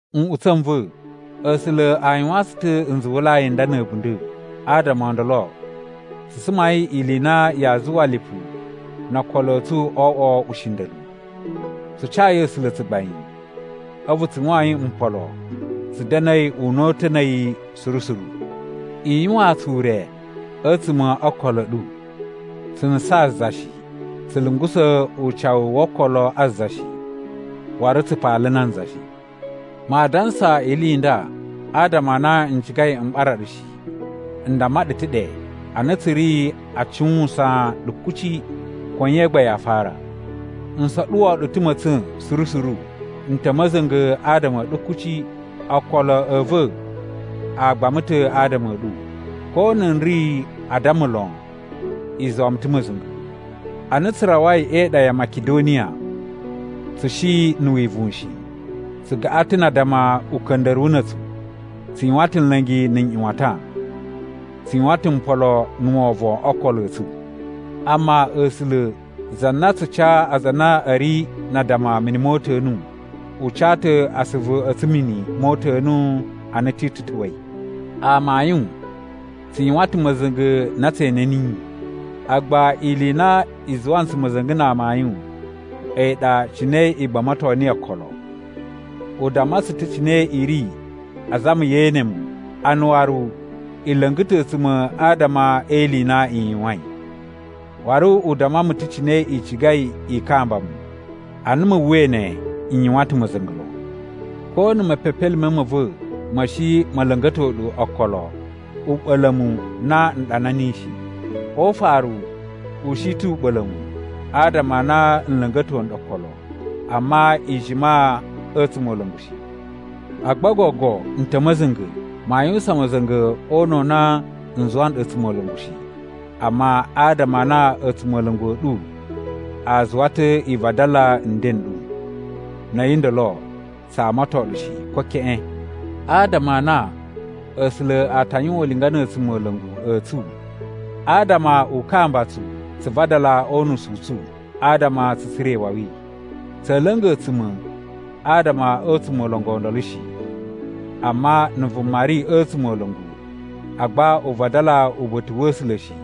Nꞌutsa̱ n va̱, A̱sula̱ a yuwaan tsu ta̱ nzuwulai n nda na̱ a̱bunda̱. Adama o ndolo tsu sumai ili i na yaa zuwa lipu no okolo a̱ tsu o oꞌwo ushinda̱lu. Tsu cayi A̱sula̱ tsugbain a̱vu tsu yuwain mpolo tsu da̱na̱i una̱ta̱ na̱ a̱yi suru suru. I yuwaan tsu ure a̱tsuma̱ o okolo a̱ ɗu! Tsu nusaan za shi. Tsu lungusa̱ ucawu wo okolo a za shi. Waru tsu paala nanza shi. Maa dansa ili i nda adama a na n cigai m ɓara ɗu shi. N damma ɗu ta̱ ɗe a na tsu ri a cuwusan ɗu kuci, ko nye gba yaa farasa. N soɗuwo ɗu ta̱ ma̱tsa̱n suru suru. N ta̱ ma̱za̱nga̱ adama a̱ ɗu kuci. Okolo a̱ va̱ a gbama ta̱ adama a̱ ɗu. Ko na n ri a addama lon, i zuwa mu ta̱ ma̱za̱nga̱. Ana tsu rawai e iɗa ya Makidoniya, tsu shi na̱ wivuwun shi. Tsu gaꞌan ta̱ na addama uka̱nda̱ruwu na̱ a̱tsu. Tsu yuwan ta̱ nla̱ngi na̱ nꞌyuwatan. Tsu yuwan ta̱ mpolo na̱ wovon o okolo a̱ tsu. Amma A̱sula̱, za na tsu ca aza a na a̱ ri na addama mini mo uta̱nu, u ca ta̱ asuvu a̱ tsu mini mo uta̱nu ana Titu ta̱wa̱i. Amayun, tsu yuwan ta̱ ma̱za̱nga̱ na tse ene niyi, agba ili i na i zuwa ntsu ma̱za̱nga̱ na amayun a̱yi ɗa cine i gbamato niyi okolo. U damma tsu ta̱ cine i ri azama ye ene mu a na waru i la̱nga̱ ta̱ a̱tsuma̱ adama e ili i na i yuwain. Waru u damma mu ta̱ cine i cigai i kamba mu. Ana mu uwwai ne, n yuwan ta̱ ma̱za̱nga̱ lon. Ko na̱ mepepelime ma̱ va̱ ma̱ shi ma̱ la̱nga̱to ɗu okolo, u ɓa̱la̱ mu na n ɗana niyi shi. O ufaru u shi ta̱ u ɓa̱la̱ mu, adama a na u la̱nga̱to nɗu okolo, amma i jima a̱ a̱tsumola̱ngu shi. Agba gogo n ta̱ ma̱za̱nga̱. Maa yuwusan ma̱za̱nga̱ o una̱ u na n zuwa nɗu a̱tsumola̱ngu shi, amma adama a na a̱tsumola̱ngu a̱ ɗu a zuwa ta̱ i vadala nden n ɗu. Na̱ a̱yi ndolo, tsa amaton ɗu shi ko keꞌen. Adama a na A̱sula̱ a ta yuwan ulinga na̱ a̱tsumola̱ngu a̱ tsu adama u kamba tsu tsu vadala o unusu u tsu adama tsu tsura̱ iwawi. Tsa̱a̱ la̱nga̱ a̱tsuma̱ adama a̱ a̱tsumola̱ngu o ndolo shi. Amma na̱ vuma ri a̱ a̱tsumola̱ngu, agba u vadala uba̱ta̱ wa̱ A̱sula̱ shi,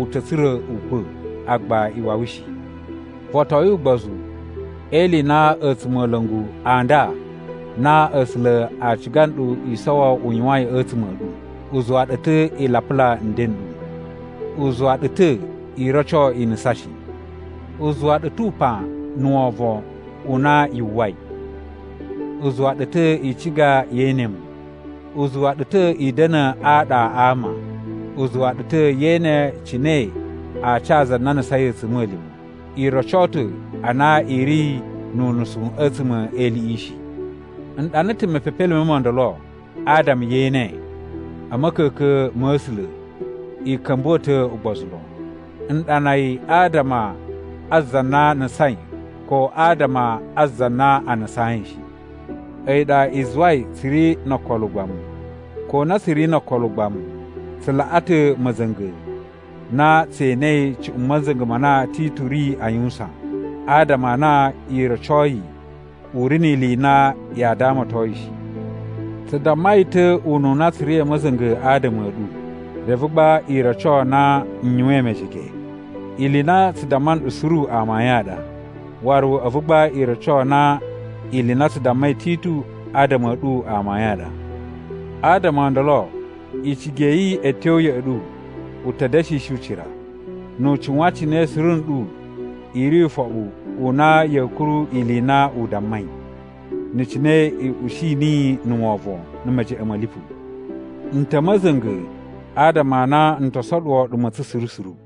u ta̱ tsura̱ ukwa̱, agba iwawi shi. Votoyin ugbozu e ili i na a̱tsumola̱ngu a nda na A̱sula̱ a ciga nɗu i sowo u yuwain a̱tsuma̱ a̱ ɗu. U zuwa ɗu ta̱ i lapula nden n ɗu. U zuwa ɗu ta̱ i roco i nusan shi. U zuwa ɗu ta̱ upan na̱ wovon u na yu uwwai. U zuwa ɗu ta̱ i ciga yee ene mu. U zuwa ɗu ta̱ i da̱na̱ aɗa a ama. U zuwa ɗu ta̱ ye ene cine a ca za na nusain a̱tsuma̱lima̱. I roco ta̱ a na i ri nu unusu a̱tsuma̱ e iliꞌi shi. N ɗana ta̱ mepepelime mo ndolo adama ye ene, a̱ ma̱ka̱ka̱n ma̱ A̱sula̱, i ka̱mbuwa̱ ta̱ ugbozu lon. N ɗana yi adama a za na nusain, ko adama a za na a nusayin shi. A̱yi ɗa i zuwai tsu ri no okolo ugbamu. Ko na tsu ri no okolo ugbamu, tsu laꞌa ta̱ ma̱za̱nga̱ na tse enei cuꞌun ma̱za̱nga̱ ma na Titu ri a yuwusan, adama a na i rocoi u ri ni ili i na yaa damaton yi shi. Tsu damma yi ta̱ ununa tsu ri a̱ ma̱za̱nga̱ adama a̱ ɗu, reve gba i roco na n yuwain mejege. Ili i na tsu damma nɗu suru amayun a ɗa, waru a̱vu gba i roco na ili i na tsu dammai Titu adama a̱ ɗu amayun a ɗa. Adama o ndolo icigi ya̱ yi a̱ tyo ya̱ꞌa̱ ɗu u ta̱ da̱shishi ucira, nu u cuwan cine suru nɗu i ri ufoɓu u na ya̱a̱ kuru ili i na u dammai, na̱ cine i ushi niyi na̱ wovon na̱ mejeꞌen ma̱ lipu. N ta̱ a̱ ma̱za̱nga̱ adama a na n to soɗuwo ɗu ma̱tsa̱n suru suru.